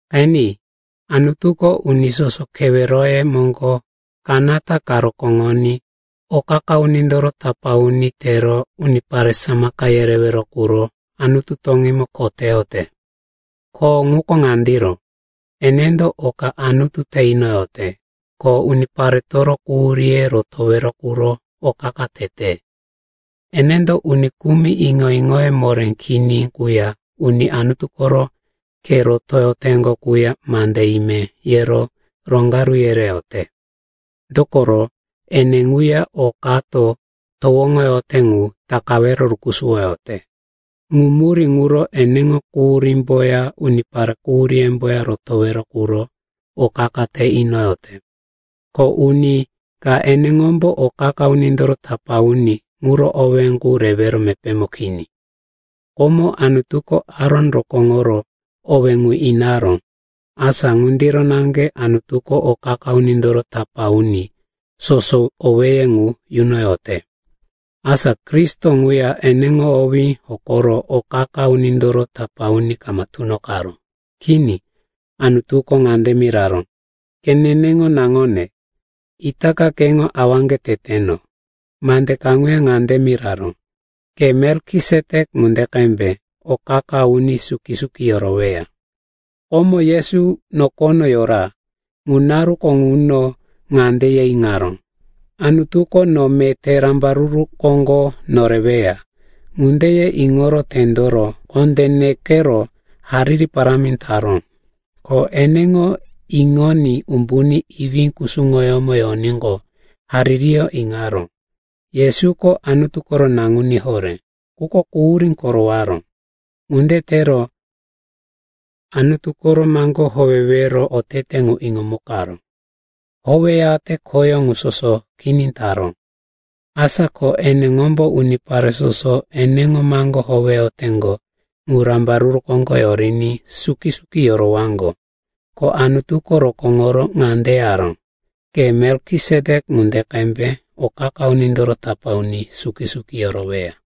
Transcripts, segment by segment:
Qeni, Anutuko uni soso keweroye moŋgo kanata ka rokóŋoní o qa-qa unindoro tapá uni tero unipare samaka yerewero quro Anutu toŋímo kho teyote. Kho ŋuko ŋandiro, enendo oka Anutu te inoyote, ko uniparetoro quhuríye rotowero quro o qa-qa tete. Enendo uni kumi iŋo-iŋoye moré kini quya uni Anutu koro khe rotoyoteŋgo quya mande ime yero roŋgaru yereyote. Dokoro ene ŋuya o kato towoŋoyote ŋu takawero rukusuwoyote. Ŋu murí ŋuro eneŋo quhuríyómboya unipare quhuríyemboya rotowero quro o qa-qa te inoyote. Ko uni ka eneŋombo o qa-qa unindoro tapá uni ŋuro owé qu rewero mepémo kini. Komo Anutuko Aron rokóŋoro owé ŋu inaró. Asa ŋundiro naŋge Anutuko o qa-qa unindoro tapá uni soso owéye ŋu yunoyote. Asa Kristo ŋuya eneŋo owí hokoro o qa-qa unindoro tapá uni kama tunoqaró. Kini. Anutuko ŋande miraró, “Ke neneŋo naŋone. Itaka keŋo awaŋge teteno.” Mande kaŋuya ŋande miraró, “Ke Melkisetek ŋunde qembe o qa-qa uni suki-suki yoroweya.” Komo Yesu nokono yora. Ŋu naruko ŋuno ŋande ye iŋaró, “Anutuko no meté rambaruru koŋgo noreweya.” Ŋunde ye iŋoro tendoro, kondé nekero, hariri parámi taró. Ko eneŋo iŋoní umbuní iwí kusuŋoyómo yoníqo haririyó iŋaró. Yesuko Anutu koro naŋuní horé, quko quhurí korowaró. Ŋunde tero Anutu koro maŋgó howewero otete ŋu iŋomukaró. Howeyate khoyó ŋu soso kini taró. Asa ko eneŋombo unipare soso eneŋo maŋgó howeyoteŋgo ŋu rambaruru koŋgo yoriní suki-suki yorowaŋgo. Ko Anutuko rokóŋoro ŋande yaró, “Ke Melkisetek ŋunde qembe o qa-qa unindoro tapá uni suki-suki yoroweya.”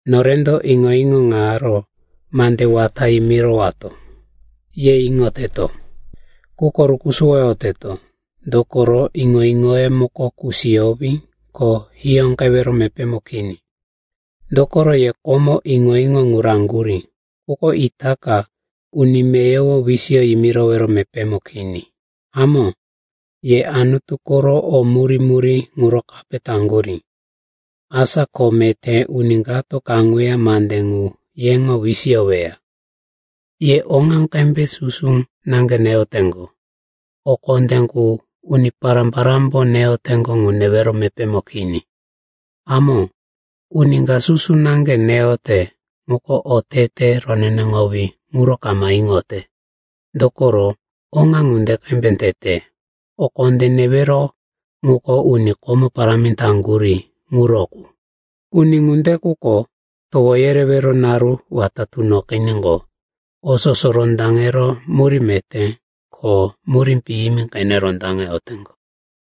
Norendo iŋo-iŋo ŋaro mande wata yimirowato, ye iŋoteto. Quko rukusuwoteto, dokoro iŋo-iŋoye muko kusiyowí, ko hiyóqewero mepémo kini. Dokoro ye komo iŋo-iŋo ŋu raŋgurí, quko itaka uni meyowo wisiyo yimirowero mepémo kini. Hamó, ye Anutu koro o murí-murí ŋuro kape taŋgurí. Asa ko meté uni kato kaŋuya mande ŋu yeŋo wisiyoweya. Ye oŋa qembe susu naŋge neyoteŋgo, o kondé qu uni pará-parámbo neyoteŋgo ŋu newero mepémo kini. Hamó, uni ka susu naŋge neyote quko otete roneneŋowí ŋuro kama iŋote, dokoro oŋa ŋunde qembe tete. O kondé newero ŋuko uni komo parámi taŋgurí ŋuro qu. Uni ŋunde quko towo yerewero naru wata tunoqiníqo, o soso rondaŋero murí meté ko murí piyimi qene rondaŋeyoteŋgo.